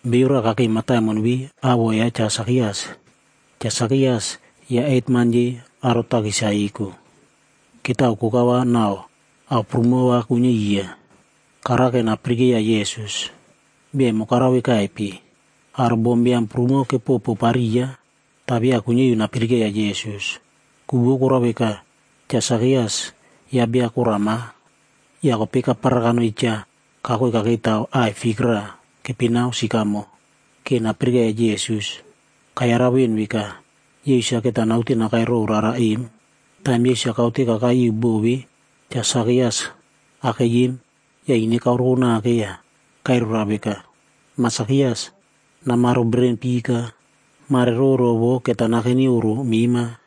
Beiyo raꞌa kakei mataimon ve awoꞌo ya Cha Sakias. Cha Sakias yaꞌa hetman yei aro takis-a eko. Ketao koka va nau ao prumo va kuinyia iya. Karake napirikeiya Yesus, bia emo karao vekaipe. Aro bombiam prumo kepopopariya, ta via kuinyia iu napirikeiya Yesus. Ku vou korao veka, Cha Sakias yaꞌa bia korama. Ya kopei kaparara kanoi cha kakoi kakeitaw aꞌai fik raꞌa keipinao “sikamo” ke napirikeiya Yesus. Kayarau ven veka, Yesus-a keta naute nakai row rara em. Taim Yesus-a kaute kakai iu bo ve Cha Sakias akei em, ya ine kaoreko nake ya kairai roa veka, “Ma Sakias, namaro bereren pika. Mare roro vo keta nakeni oꞌro mema.”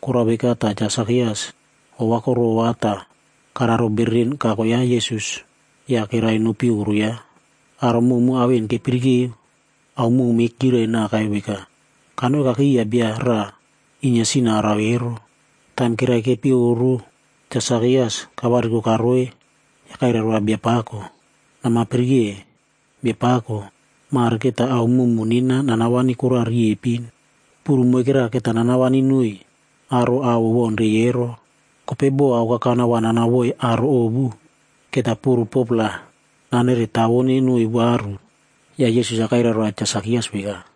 Korao veka ta Cha Sakias ova korova ta kararo bereren kako yaꞌa Yesus ya kerai nopi oꞌro yaꞌa. Aro mowmow ao en kepirikeo, aomowme kyirai naka veka, “Kanoi kakei iya bia raꞌa inyia sin-a arao ero.” Taim kerai kepi oꞌro, Cha Sakias kavariko karoi ya kairai roa Biapako, “Nama pirike, Biapako! Mare keta ao mowmow nena nanawani kora riepin. Puru moikera keta nanawani noiy aro ao owaunrei ero. Kopei bo aokakana va nanao voiy aro ovu, keta puru 4-pla naneretawone noiy varu.” Ya Yesus-a kairai roa Cha Sakias veka,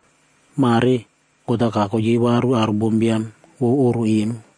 “Mare God-a kako yei varu aro bombiam vou oꞌro em.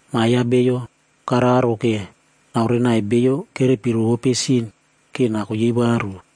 Ma ya Bio kararo ke naorenai beiyo kerepi rovope sin ke nako yei varu.”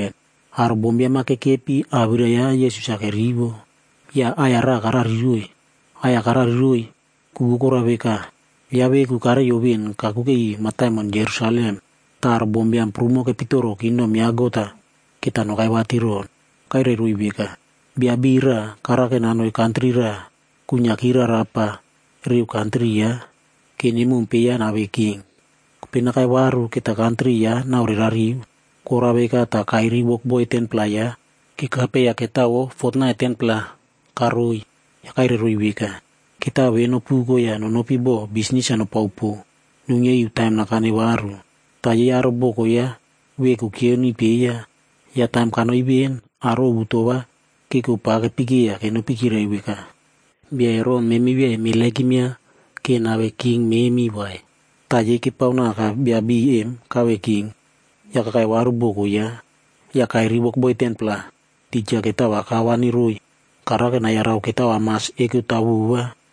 Aro bombiam-a kekepi awirai ya Yesus-a kerivo, ya aꞌai-ya raꞌa karariroiy. Aꞌai-ya karariroiy, ku vou korao veka, yaꞌa veku kareiyo ven kakuke iu mataimon Jerusalem. Ta aro bombiam prumo kepitoro kingdom ya God-a keta nokai vatiron. Kairairoiy veka, “Bia beiy raꞌa karake nanoi kantri raꞌa kuinyiaki rarapa reu kantri yaꞌa, ke nemompe yaꞌa nave king. Kopei nakai varu keta kantri yaꞌa naorerariu. Korao veka ta kairiy wokboi 10-pla yaꞌa kekape ya ketao vou fotnait 10-pla karoiy. Ya kairai roiy veka, ‘Ketao ve nopuko ya nonopi bo bisnis-a nopao po, nuinyia iu taim nakane varu.’ “Ta yei aro boko yaꞌa veku kyioniy peiya. Ya taim kanoi ven, aro ovu to va keko pa kepekeiya kenopi kyirai veka, ‘Bia ero memi via emeremova nave king memi vai.’ “Ta yei kepaonaka bia beiy em kave king, ya kakai varu boko yaꞌa. Ya kairiy wokboi 10-pla, tija ketao va kawani roiy. Karake nayarau ketao amas eko taw vova.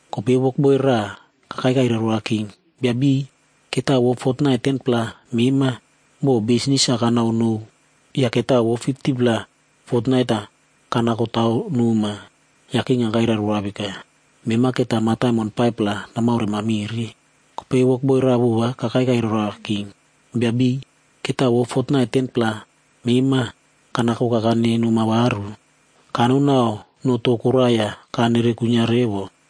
“Kopei wokboi raꞌa kakai kairai roa king, ‘Bia beiy, ketao vou fotnait 10-pla mema, bo bisnis-a kanao nou ya ketao vou 50-pla fotnait-a kanako taw noma.’ “Ya king-a kairai roa veka, ‘Mema keta mataimon 5-pla namaoremamire.’ “Kopei wokboi raꞌa vova kakai kairai roa king, ‘Bia beiy, ketao vou fotnait 10-pla mema, kanakokane noma varu. Kano nau no to koraꞌa ya kanere kuinyia revo.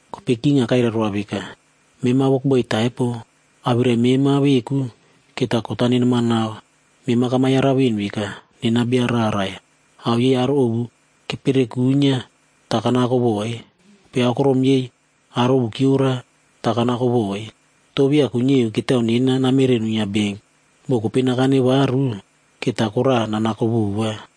“Kopei king-a kairai roa veka, ‘Mema wokboi taipo, awirai mema veku keta kot-a nenemanao. Mema kama yarau ven veka, nena bia rarai. Ao yei aro ovu kepere kuinyia ta kanako voiy, kopei aokorom yei aro ovu kyiora, ta kanako voiy. To via kuinyia iu ketao nena namere nuinyia benk, bo kopei nakane varu, keta kora nanako vova.’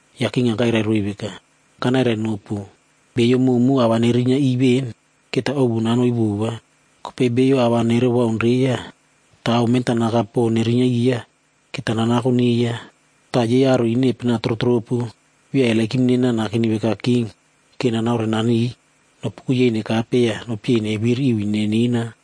“Ya king-a kairai roiy veka, ‘Kanairainopu, beiyo mowmow ao va nerinyia iꞌiy ven, keta ovu nanoiy vova. Kopei bio ao va nerewaunreiya, ta ao mentanaka po nerinyia iya, keta nanako neiya. Ta yei aro ine epena trotropu via eperepona nakeni veka king, ke nanaorenaniy. Nopuko yei nekape ya nopyei neviri iu ine nena.’”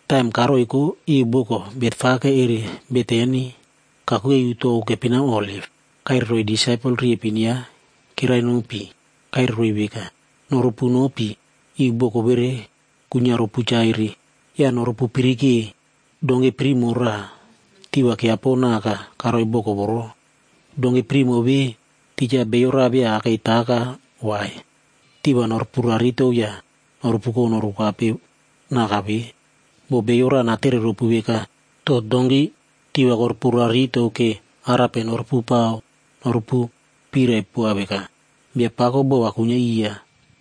Taim karoiko iu boko Betfage eri Betani kakuke iu tou keipinao Oliv, ya kairai roiy disaipel riepin yaꞌa kerai nopi. Ya kairai roiy veka, “Norupu nopi iu boko vere kuinyia ropu chaire. Ya norupu pirike donki primo raꞌa, tiꞌi va kyiapo naka karoi boko voro. Donki primo ve, tija bio raꞌa via akei taka vai. Tiꞌi va norupu raritou ya norupuko norukape naka ve. Bo bio raꞌa natere ropu veka, ‘To donki tiꞌi va korupu raritou ke arape norupu pao?’ Norupu pirai poa veka, ‘Biapakob bo va kuinyia iya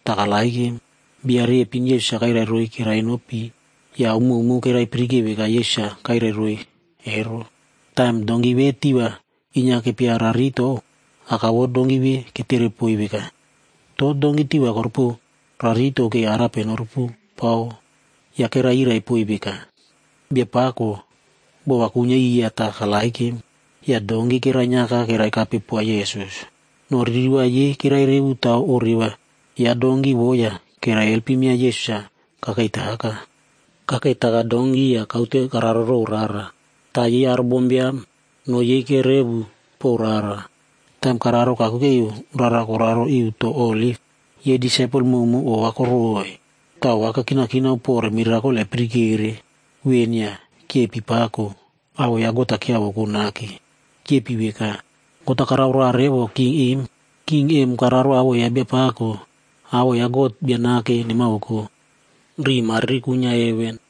ta karererow.’” Bia riepin Yesus-a kairai roiy kerai nopi, ya ao mowmow kerai pirike veka Yesus-a kairai roiy ero. Taim donki ve tiꞌi va inyia kepia raritou, aka vou donki ve ketere poiy veka, “To donki tiꞌi va korupu raritou ke arape norupupao?” Ya kerai yirai poiy veka, “Biapako bo va kuinyia iya ta karererow.” Ya donki kerainyiaka keraikape poa Yesus. No ririva yei kerairevu taw oreva ya donki vo ya keraielpim yaꞌa Yesus-a kakei taka. Kakei taka donki ya kaute kararo row rara, ta yei aro bombiam no yei kerevu pow rara. Taim kararo kakuke iu rara koraro iu tou Oliv, yei disaipel mowmow ova koroꞌoi. Ta ova kekinakinao pore mirakol epirikere ven ya kyepi pako, awoꞌo ya God-a kyiavoko nake. Kyepi veka, God-a karao roa revo king em. King emo kararo awoꞌo ya Biapako. c Awoꞌo ya God Bia Nake nemavoko, riꞌi mariri kuinyia heven.”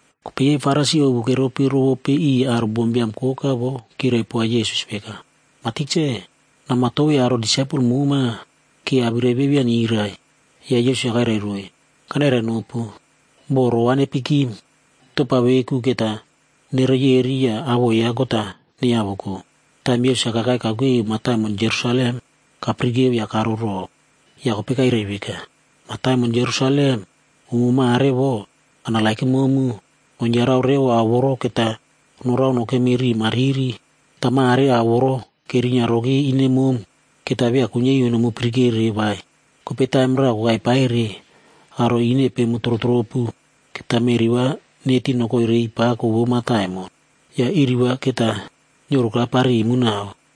Kopei yei Farisi ovu keropi rovope iꞌiy aro bombiam koka vo, kyirai poa Yesus veka, “Ma Tikse, nama tovei aro disaipel moma, ke awirai ve via nyirai.” Ya Yesus-a kairai roiy, “Kanairainopu, bo roꞌo va nepikim, topa veku keta nereyeri ya awoꞌo ya God-a neiyavoko.” Taim Yesus-a kakai kakuke iu mataimon Jerusalem,d kapirikeo ya karo row. Ya kopei kairai veka, “Mataimon Jerusalem, umo mare vo, kanerenomu, nonyarau revo ao voro keta norao nokemi riꞌi mariri. Ta mare ao voro kerinyia roki ine mom, keta via kuinyia iu nomu pirikere vai. Kopei taim raꞌa kokai paire, aro ine epemu trotropu keta meꞌri va neti nokoi reiy pako vou mataimon. Ya iri va keta nyioroka parimu nau.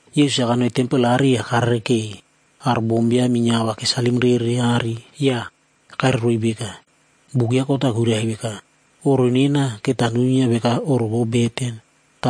Yesus-a kanoi tempel aꞌari ya karerekei aro bombiam inyia ao va kesalim rere aꞌari. Ya kairai roiy veka, “Buk ya God-a kuirai veka, ‘Oꞌro nena, keta nuinyia veka oꞌro vou beten.’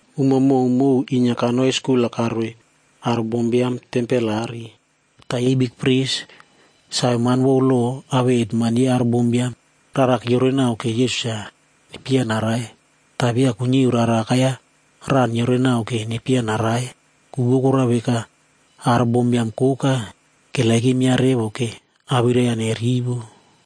Umo mowmow inyia kanoi skul-a karoiy aro bombiam tempel aꞌari. Ta yei bikpris,g saveman vou lo awei hetman yei aro bombiam, rara kyiorenao ke Yesus-a nepyeiya narai. Ta via kuinyia iu rara akai-ya raꞌa nyiorenao ke nepyeiya narai. Ku vou korao veka, aro bombiam koka keperepova revo ke awirai yaꞌa nerivo.